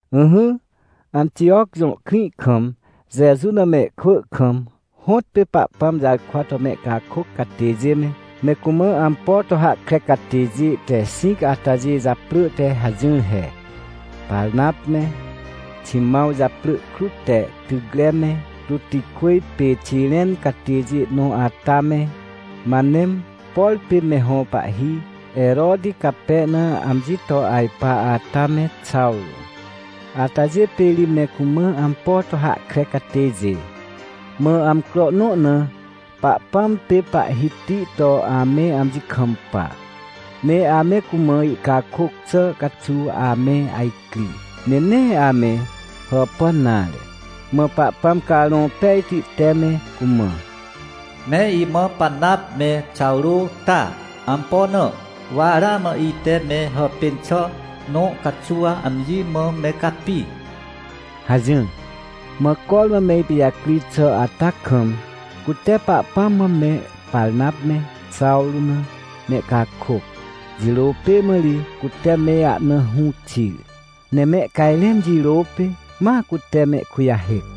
Ỹhỹ, Antijoc jõ krĩ kam Jeju na mehkwỳ kam, hõtpê Pahpãm jarkwa to mehcakôc catêjê me, me cumã ampo to hahkre catêjê te xĩc atajê japrỳ te hajỹr he: Parnap me, Ximãw japrỳ krut te Tycre me, Ruxô pê Xiren catêjê nõ ata me, Manem, por pê me hõ pahhi Heroti cape na amji to ajpa ata me, Xawrô. Atajê pê ri me cumã ampo to hahkre catêjê. Mã amcro nõ na, Pahpãm pê Pahhiti to ame amji kampa, ne ame cumã ihcakôc xà caxuw ame ajcri, ne nee ame hàpàn nare. Mã Pahpãm Carõ Pejti te me cumã: — Me imã Parnap me Xawrô ta. Ampo na? Wa ramã ite me hàpên xà nõ caxuw amji mã me capi — hajỹr. Mã cormã me ipijacri xà ata kam, cute Pahpãm mã me Parnap me Xawrô na mehcakôc, jirô pê mã ri cute me ahna hũ xir, ne mehcajrẽn jirô pê, ma cute mehkujahêc.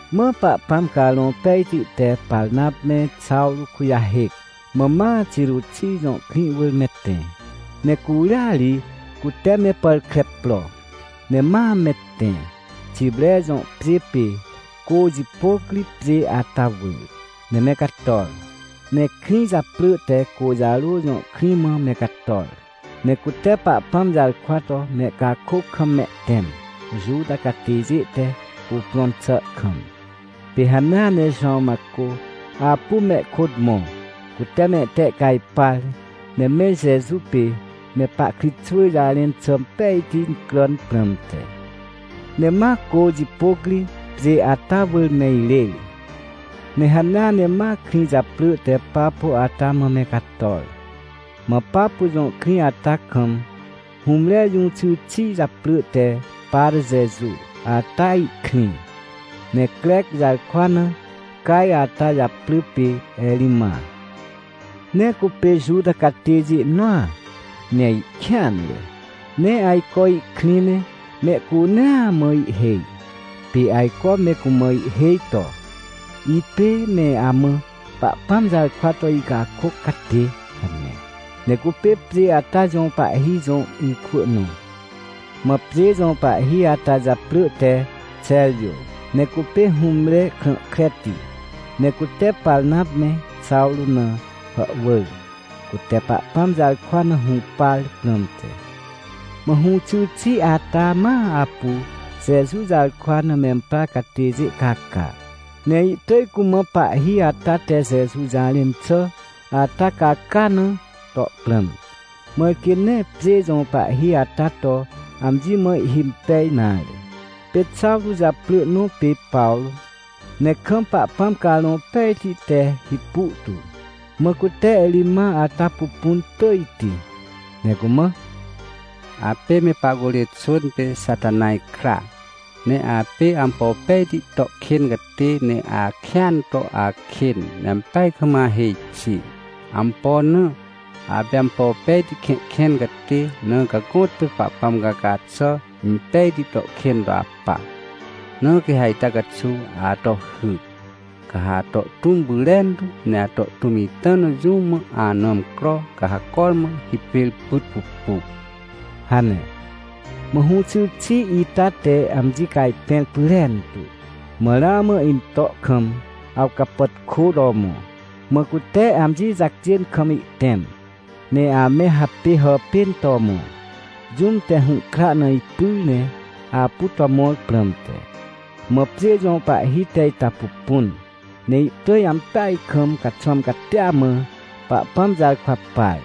Mã Pahpãm Carõ Pejti te Parnap me Xawrô kujahêc, mã ma Xeruxij jõ krĩ wỳr me tẽ, ne curia ri cute me pàr kre pro, ne ma me tẽ, Xipre jõ pjê pê cô jipôc ri pjê ata wỳr, ne me cator. Ne krĩ japrỳ te Côjarô jõ krĩ mã me cator, ne cute Pahpãm jarkwa to mehcakôc kam mehtẽm, Juta catêjê te cuprõn xà kam. Pê hanea ne Jowãw Macô apu mehkôt mõ, cute mehtehcajpar, ne me Jeju pê me pahkritxwỳ jarẽn xà impejti incràn prãmte. Ne ma cô jipôc ri pjê ata wỳr me irêr, ne hanea ne ma krĩ japrỳ te Papo ata mã me cator. Mã Papo jõ krĩ ata kam hũmre jũxy xi japrỳ te Parjeju ata ihkrĩ. Ne Crec jarkwa na caj ata japrỳ pê Erima. Ne cupê Juta catêjê nõa ne ihkêanre, ne ajco ihkrĩ ne mehcunea mã ihhêj. Pê ajco me cumã ihhêj to: — Ipê me amã Pahpãm jarkwa to icakôc catê — hane. Ne cupê pjê ata jõ pahhi jõ ikwỳ nõ. Mã pjê jõ pahhi ata japrỳ te Xerjô, ne cupê hũmre krã kreti. Ne cute Parnap me Xawrô na hàhwỳr, cute Pahpãm jarkwa na hũpar prãmte. Mã hũxy xi ata ma apu Jeju jarkwa na memprar catêjê caca. Ne ihtỳj cumã pahhi ata te Jeju jarẽn xà ata caca na to prãm. Mãr quê nee pjê jõ pahhi ata to amji me ihhimpej nare. Pê Xawrô japrỳ nõ pê Pawrô, ne kam Pahpãm Carõ Pejti te hipu tu, mã cute Erima ata pupun tỳjti, ne cumã: — Apê me pahcurê xwỳn pê Xatanaj kra. Ne apê ampo pejti to kên catê, ne akêan to akên, ne ampeaj kam ahêj xi. Ampo na? Apê ampo pejti kẽhkẽn catê, na ca gõtpê Pahpãm caca xà impejti to kên to apa. Na quê ha ita caxuw ato hy. Ca ha ato tũm pyrentu, ne ato tũm ita na jũ mã ana amcro, ca ha cormã hipêr pyt pupu — hane. Mã hũxy xi ita te amji cajpẽr pyrentu, mã ramã into kam awcapàtkô to mõ, mã cute amji jacjên kam ihtẽm, ne ame hapê hàpên to mõ, jũm te hũhkra na ipyr ne apu to mõr prãmte. Mã pjê jõ pahhi te ita pupun, ne ihtỳj ampeaj kam caxwãm catia mã Pahpãm jarkwa par,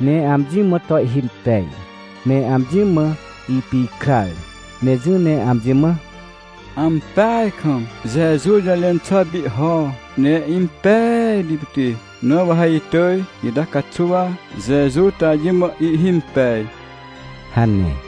ne amji mã to ihhimpej. Ne amji mã ipikrar, ne jỹ ne amji mã: — Ampeaj kam Jeju jũjarẽn xà pihho ne impejti pit, na wa ha itỳj ita caxuw Jeju to amji mã ihimpej — hane.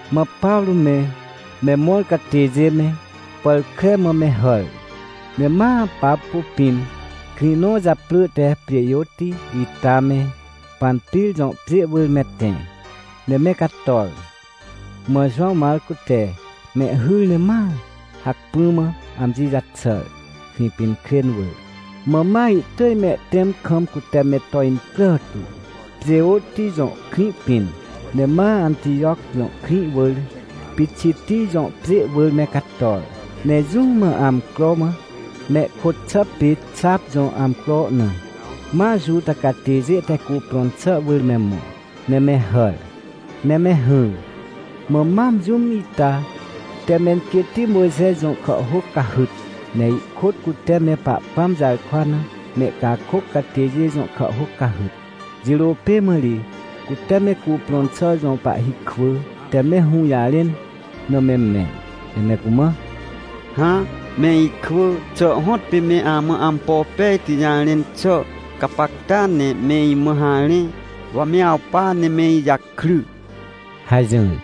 Mã Pawrô me, me mõr catêjê me, pàr kre mã me hàr, ne ma Papo pĩn, krĩ nõ japrỳ te Pjêjôti ita me, Panpir jõ pjê wỳr me tẽ, ne me cator. Mã Jowãw Macô te mehhyr ne ma hacpỹ mã amji jaxàr, Krĩpinkrên wỳr. Mã ma ihtỳj mehtẽm kam cute me to incrà tu, Pjêjôti jõ krĩ pĩn, ne ma Antijoc jõ krĩ wỳr, Pixitij jõ pjê wỳr me cator. Ne jũ mã amcro mã, mehkôt xà pê xap jõ amcro na, ma Juta catêjê te cuprõn xà wỳr me mõ, ne me hàr, ne me hỹr. Mã mam jũm ita te menquêtti Mojxe jõ kàhhôc cahyt, ne ihkôt cute me Pahpãm jarkwa na mehcakôc catêjê jõ kàhhôc cahyt. Jirô pê mã ri, cute me cuprõn xà jõ pahhi kwỳ te me hũjarẽn na me mẽn, ne me cumã: — Hã, me ikwỳ, xà hõtpê me amã ampo pejti jarẽn xà? Gapacta ne me imã harẽ, wa me awpa ne me ijakry — hajỹr.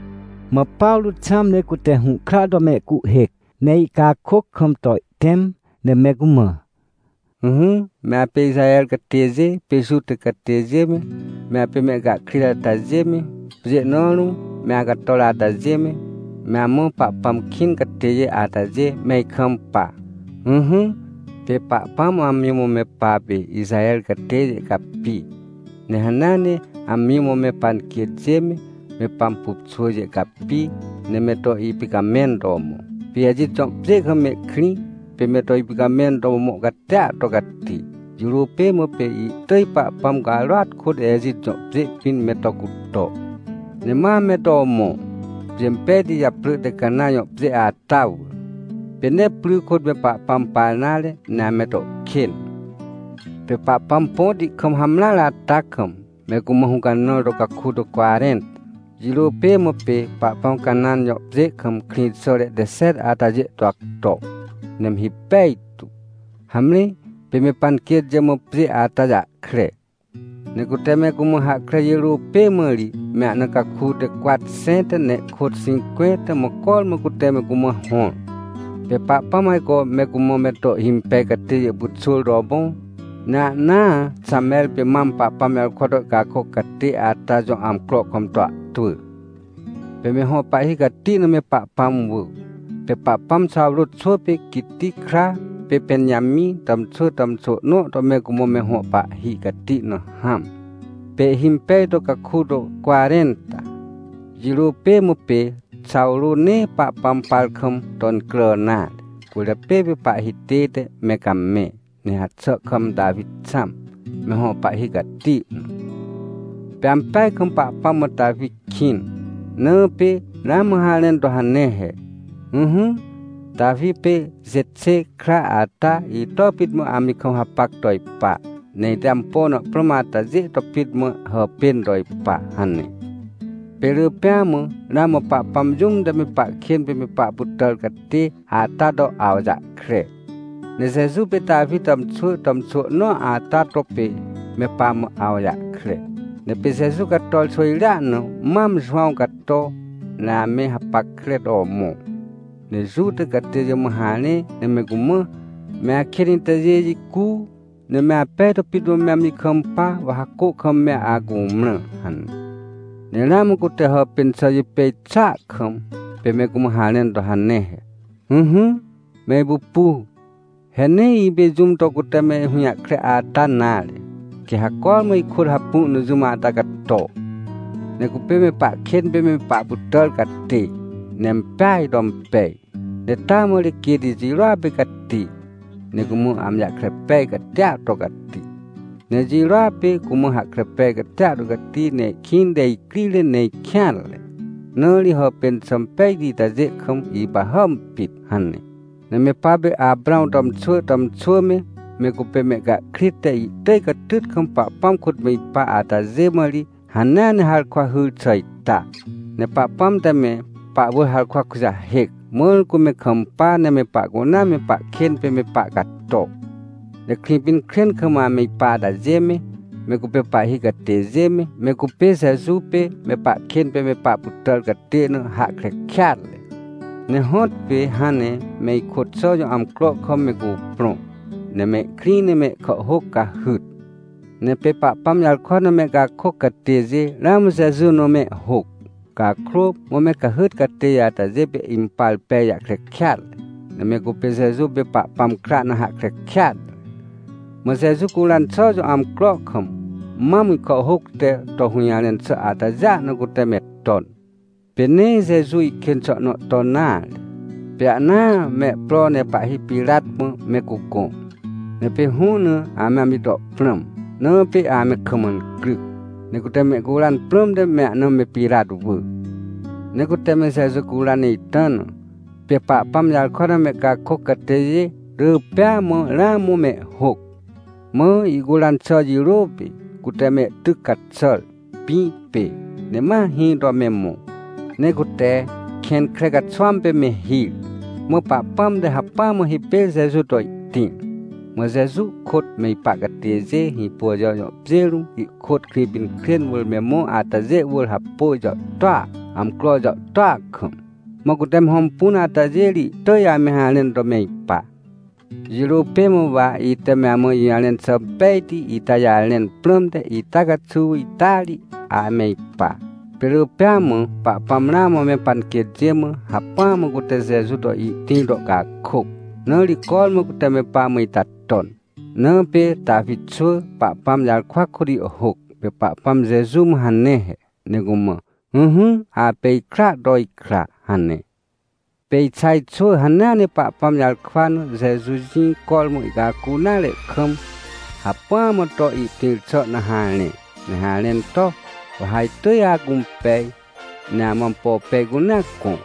Mã Pawrô xãm ne cute hũhkra to mehcuhhêc, ne ihcakôc kam to ihtẽm ne me cumã: — Ỹhỹ, me apê Ixaher catêjê pê Juta catêjê me, me apê mehcahkrit atajê me, pjê nõ rũm me acator atajê me, me amã Pahpãm kĩn catêjê atajê, me ikampa. Ỹhỹ, pê Pahpãm amji mã me papê Ixaher catêjê capi. Ne hanea ne amji mã me panquêtjê me, me pampupxwỳjê capi, ne me to ipicamẽn to mõ. Pê Ejit jõ pjê kam mehkrĩ, pê me to ipicamẽn to mõ catia to cati. Jirô pê mã pê ihtỳj Pahpãm carôat kôt Ejit jõ pjê pĩn me to cuto. Ne ma me to mõ, pjê impejti japrỳ te Cana jõ pjê ata wỳr. Pê nee pry kôt me Pahpãm par nare, ne ame to kên. Pê Pahpãm põti kam hamreare ata kam me cumã hũcanãr to caku to cwarẽnta. Jirô pê mã pê Pahpãm Canãn jõ pjê kam krĩxàre te xet atajê to acto, ne me hipej tu. Hamre, pê me panquêtjê mã pjê ata jahkre. Ne cute me cumã hahkre jirô pê mã ri me ahna caku te cwatxẽnta ne ihkôt xĩncwẽnta mã cormã cute me cumã hõr. — Pê Pahpãm ajco me cumã me to ihhimpej catêjê pyxwỳr to mõ, ne ahnaa Xamer pê mam Pahpãm jarkwa to ihcakôc catê ata jõ amcro kam to ahtwỳ. Pê me hõ pahhi cati na me Pahpãm wỳ. Pê Pahpãm Xawrô xwỳ pê Quiti kra, pê Pẽnjamĩ tàmxwỳ tàmxwỳ nõ to me cumã me hõ pahhi cati na hãm, pê ihhimpej to caku to cwarẽnta. Jirô pê mã pê Xawrô nee Pahpãm par kam to incrà nare, cwỳrjapê pê pahhi tête me camẽ, ne haxà kam Tawi xãm, me hõ pahhi cati na. Pê ampeaj kam Pahpãm mã Tawi kĩn. Na pê ramã harẽn to hane he: “Ỹhỹ, Tawi pê Jexê kra ata, ito pit mã amji kam hapac to ipa. Ne ite ampo na prãm atajê to pit mã hàpên to ipa” hane. — Pê rỳ pêa mã ramã Pahpãm jũm te me pahkên pê me pahpytàr catê ata to awjahkre. Ne Jeju pê Tawi tàmxwỳ tàmxwỳ nõa ata to pê me pamã awjahkre. Ne pê Jeju cator xwỳjrea na mam Jowãw cato. Ne ame hapackre to mõ. Ne Juta catêjê mã harẽ, ne me cumã: “Me akên itajê jicu. Ne me apej to pit mã me amji kampa, wa ha cô kam me acumrã” hane. Ne ramã cute hàpên xà jipêj xàa kam, pê me cumã harẽn to hane he: “Ỹhỹ, me ipupu, he nee ipê jũm to cute me hũjahkre ata nare. Quê ha cormã ikôt hapu na jũm ata cato. Ne cupê me pahkên pê me pahpytàr catê, ne impeaj to impej. Ne taa mã ri quêt ijirôa pê cati. Ne cumã amji jahkre pej catia to cati. Ne ijirôa pê cumã hahkre pej catia to cati, ne ihkĩnte icrire, ne ikêanre. Na ri hàpên xà impejti itajê kam ipahàm pit” hane. — Ne me papê Aprãw tàmxwỳ tàmxwỳ me, me cupê mehcahkrit te ihtỳj catyt kam Pahpãm kôt me ipa atajê mã ri, hanea ne harkwa hyr xà ita. Ne Pahpãm te me pahwỳr harkwa kujahêc, mãr cu me kampa ne me pahcunea me pahkên pê me pahcato. Ne Krĩpinkrên kam ame ipa atajê me, me cupê pahhi catêjê me, me cupê Jeju pê me pahkên pê me pahpytàr catê na hahkre kêatre. Ne hõtpê hãn ne me ikôt xà jõ amcro kam me cuprõ, ne mehkrĩ ne mehkàhhôc cahyt. Ne pê Pahpãm jarkwa na mehcakôc catêjê ramã Jeju na mehhôc. Cakrô, mã me cahyt catêjê atajê pê impar pej jahkre kêatre, ne me cupê Jeju pê Pahpãm kra na hahkre kêatre. Mã Jeju curan xà jõ amcro kam, mam ihkàhhôc te to hũjarẽn xà atajêa na cute me ton. Pê nee Jeju ihkên xà nõ ton nare. Pê ahnaa me pro ne pahhi Pirat mã me cugõ. Ne pê hũ na ame amji to prãm, na pê ame kam incryc. Ne cute mehcuran prãmte me ahna me Pirat wỳ. Ne cute me Jeju curan ita na, pê Pahpãm jarkwa na mehcakôc catêjê rỳ pêa mã ramã mehhôc. Mã ihcuran xà jirô pê cute mehtyc caxàr, pĩ pê, ne ma hĩ to me mõ. Ne cute kẽn kre caxwãm pê me hir. Mã Pahpãm te hacpỹa mã hipêr Jeju to ihtĩr. Mã Jeju kôt me ipa catêjê Hĩpôjajo jõ pjê rũm, ihkôt Krĩpinkrên wỳr me mõ atajê wỳr hapôj jàhtôa, amcro jàhtôa kam. Mã cute me hõmpun atajê ri ihtỳj ame harẽn to me ipa. — Jirô pê mã wa ite me amã ijũjarẽn xà pejti ita jarẽn prãmte, ita caxuw ita ri ame ipa. Pê rỳ pêa mã Pahpãm ramã me panquêtjê mã, hacpỹa mã cute Jeju to ihtĩr to ihcakôc. Na ri cormã cute me pamã ita ton. Na pê Tawi xwỳ Pahpãm jarkwa kôt ihhôc, pê Pahpãm Jeju mã hane he, ne cumã: “Ỹhỹ, apê ikraa to ikra” hane. — Pê Ixaj xwỳ hanea ne Pahpãm jarkwa na, Jeju jĩ cormã ihcacu nare kam, hacpỹa mã to ihtĩr xà na harẽ, ne harẽn to: “Wa ha itỳj acũmpej, ne amã ampo pej cunea gõ.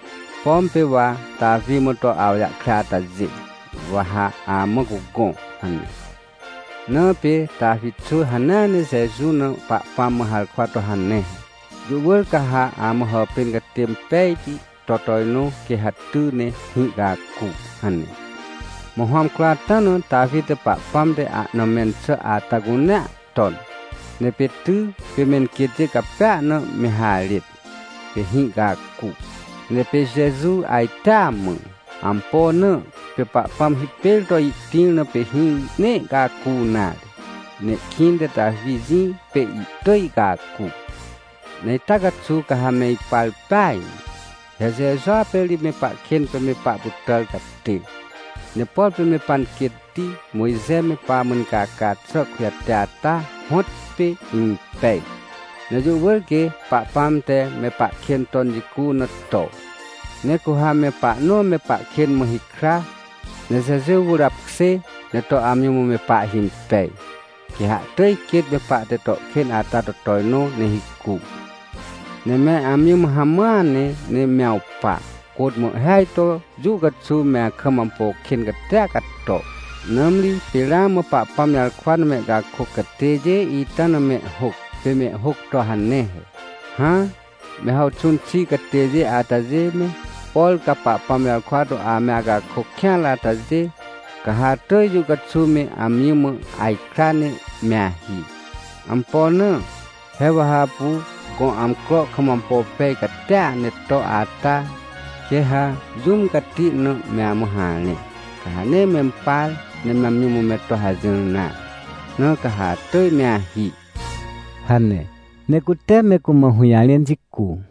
Pom pê wa Tawi mã to awjahkre atajê, wa ha amã cugõ” hane. — Na pê Tawi xwỳ hanea ne Jeju na Pahpãm mã harkwa to hane he: “Jũ wỳr ca ha amã hàpên catê impejti to tojnõ, quê ha ty ne hĩ ihcacu” hane. Mã hõ amcro ata na Tawi te Pahpãm te ahna mẽn xà ata cunea ton. Ne pê ty, pê menquêtjê capea na me harêt, pê hĩ ihcacu. Ne pê Jeju ajtea mã. Ampo na? Pê Pahpãm hipêr to ihtĩr, na pê hĩ nee ihcacu nare. Ne ihkĩnte Tawi jĩ pê ihtỳj ihcacu. Ne ita caxuw ca ha me ipar peaj ne. He Jejua pê ri me pahkên pê me pahpytàr catê. Ne por pê me panquêtti Mojxe me pamã incaca xà kujate ata, hõtpê impej. Ne jũ wỳr quê Pahpãm te me pahkên ton jicu na to. Ne cu ha me pahnõ me pahkên mã hikra, ne Jeju wỳr apkjê, ne to amji mã me pahhimpej, quê ha ihtỳj quêt me pahte to kên ata to tojnõ ne hicu. Ne me amji mã hamãa ne, ne me awpa, côt mã ihhêaj to jũ caxuw me akam ampo kên catia cato, nãmri pê ramã Pahpãm jarkwa na mehcakôc catêjê ita na mehhôc, pê mehhôc to hane he: “Hã, me hàwxũn xi catêjê atajê me, por ca Pahpãm jarkwa to ame acakôc kêanre atajê, ca ha atỳj jũ caxuw me amji mã ajkra ne me ahi. Ampo na? He wa ha apu gõ amcro kam ampo pej catia ne to ata, quê ha jũm cati na me amã harẽ, ca ha nee mempar ne amji mã me to hajỹr nare. Na ca ha atỳj me ahi” — hane. Ne cute me cumã hũjarẽn jicu.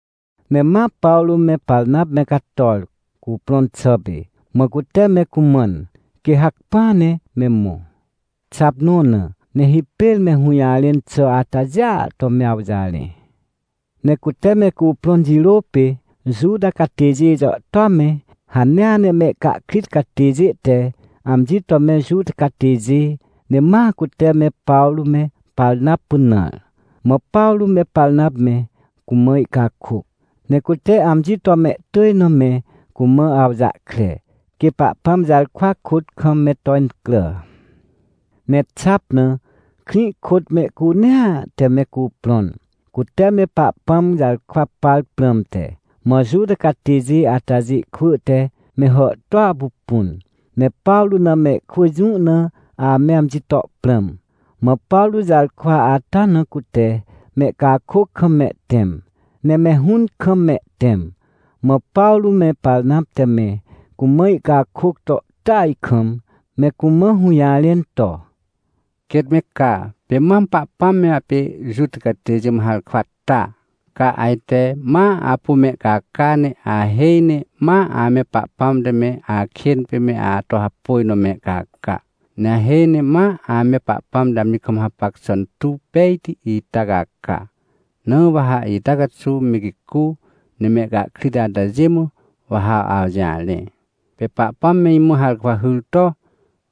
Ne ma Pawrô me Parnap me cator, cuprõn xà pê, mã cute me cumãn, quê hacpỹa ne me mõ, xap nõ na, ne hipêr me hũjarẽn xà atajêa to me awjarẽ. Ne cute me cuprõn jirô pê, Juta catêjê jàhtôa me, hanea ne mehcahkrit catêjê te amji to me Juta catêjê, ne ma cute me Pawrô me Parnap pynãr. Mã Pawrô me Parnap me cumã ihcakôc, ne cute amji to mehtỳj na me cumã awjahkre, quê Pahpãm jarkwa kôt kam me to incrà. Ne xap na, krĩ kôt mehcunea te me cuprõn, cute me Pahpãm jarkwa par prãmte. Mã Juta catêjê atajê kwỳ te me hàhtôa pupun, ne Pawrô na mehkwỳ jũ na ame amji to prãm. Mã Pawrô jarkwa ata na cute mehcakôc kam mehtẽm, ne me hũn kam mehtẽm. Mã Pawrô me Parnap te me cumã ihcakôc to tỳaj kam, me cumã hũjarẽn to: — Quêt me ca, pê mam Pahpãm me apê Juta catêjê mã harkwa ta. Ca ajte ma apu mehcaca, ne ahêj ne ma ame Pahpãm te me akên pê me ato hapôj na mehcaca. Ne ahêj ne ma ame Pahpãm te amji kam hapac xà intuw pejti ita caca. Na wa ha ita caxuw me gicu, ne mehcahkrit atajê mã, wa ha awjarẽ. Pê Pahpãm me imã harkwa hyr to: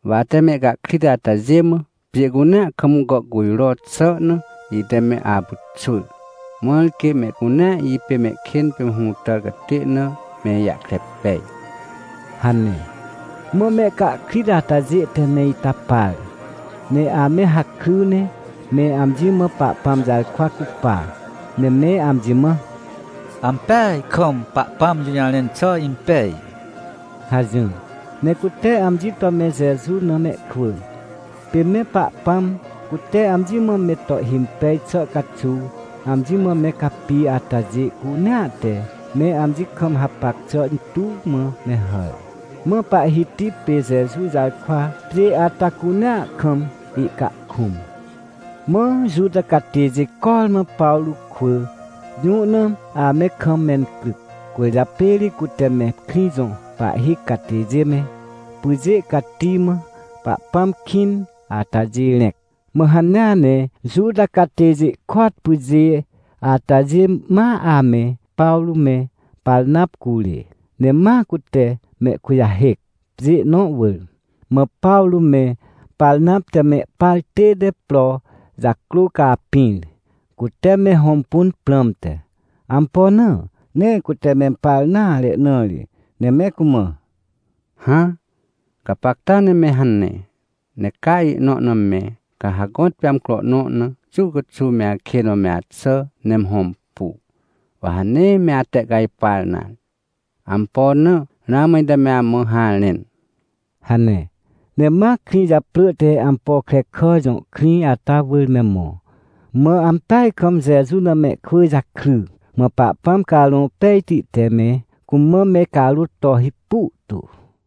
“Wa ate me mehcahkrit atajê mã, pjê cunea kam gàhcujro xà na, ite me apyxwỳr. Mãr quê mehcunea ipê mehkên pê me hũtàr catê na me ijahkre pej” — hane. Mã mehcahkrit atajê te me ita par, ne ame hakry ne me amji mã Pahpãm jarkwa cupa, ne me amji mã: — Ampeaj kam Pahpãm jũjarẽn xà impej — hajỹr. Ne cute amji to me Jeju na mehkwỳ. Pê me Pahpãm cute amji mã me to ihhimpej xà caxuw amji mã me capi atajê cunea te me amji kam hapac xà intuw mã me hàr. Mã Pahhiti pê Jeju jarkwa pjê ata cunea kam ihcahkũm. Mã Juta catêjê cormã Pawrô kwỳ jũ na ame kam mencryc, cwỳrjapê ri cute me krĩ jõ pahhi catêjê me, pyjê cati mã Pahpãm kĩn atajê rẽc. Mã hanea ne Juta catêjê kôat pyjê atajê ma ame Pawrô me Parnap curê. Ne ma cute mehkujahêc, pjê nõ wỳr. Mã Pawrô me Parnap te mehpar tête pro jacrô capĩr, cute me hõmpun prãmte. Ampo na? Nee cute mempar nare na ri, ne me cumã: — Hã, gapacta ne me hane, ne ca ihnõ na me, ca ha gõtpê amcro nõ na, jũ caxuw me akên mã axà ne me hõmpu, wa ha nee me atehcajpar nare. Ampo na? Ramã ite me amã harẽn — hane. Ne ma krĩ japrỳ te Ampokrekà jõ krĩ ata wỳr me mõ. Mã ampeaj kam Jeju na mehkwỳ jakry, mã Pahpãm Carõ Pejti te me cumã me carôt to hipu tu.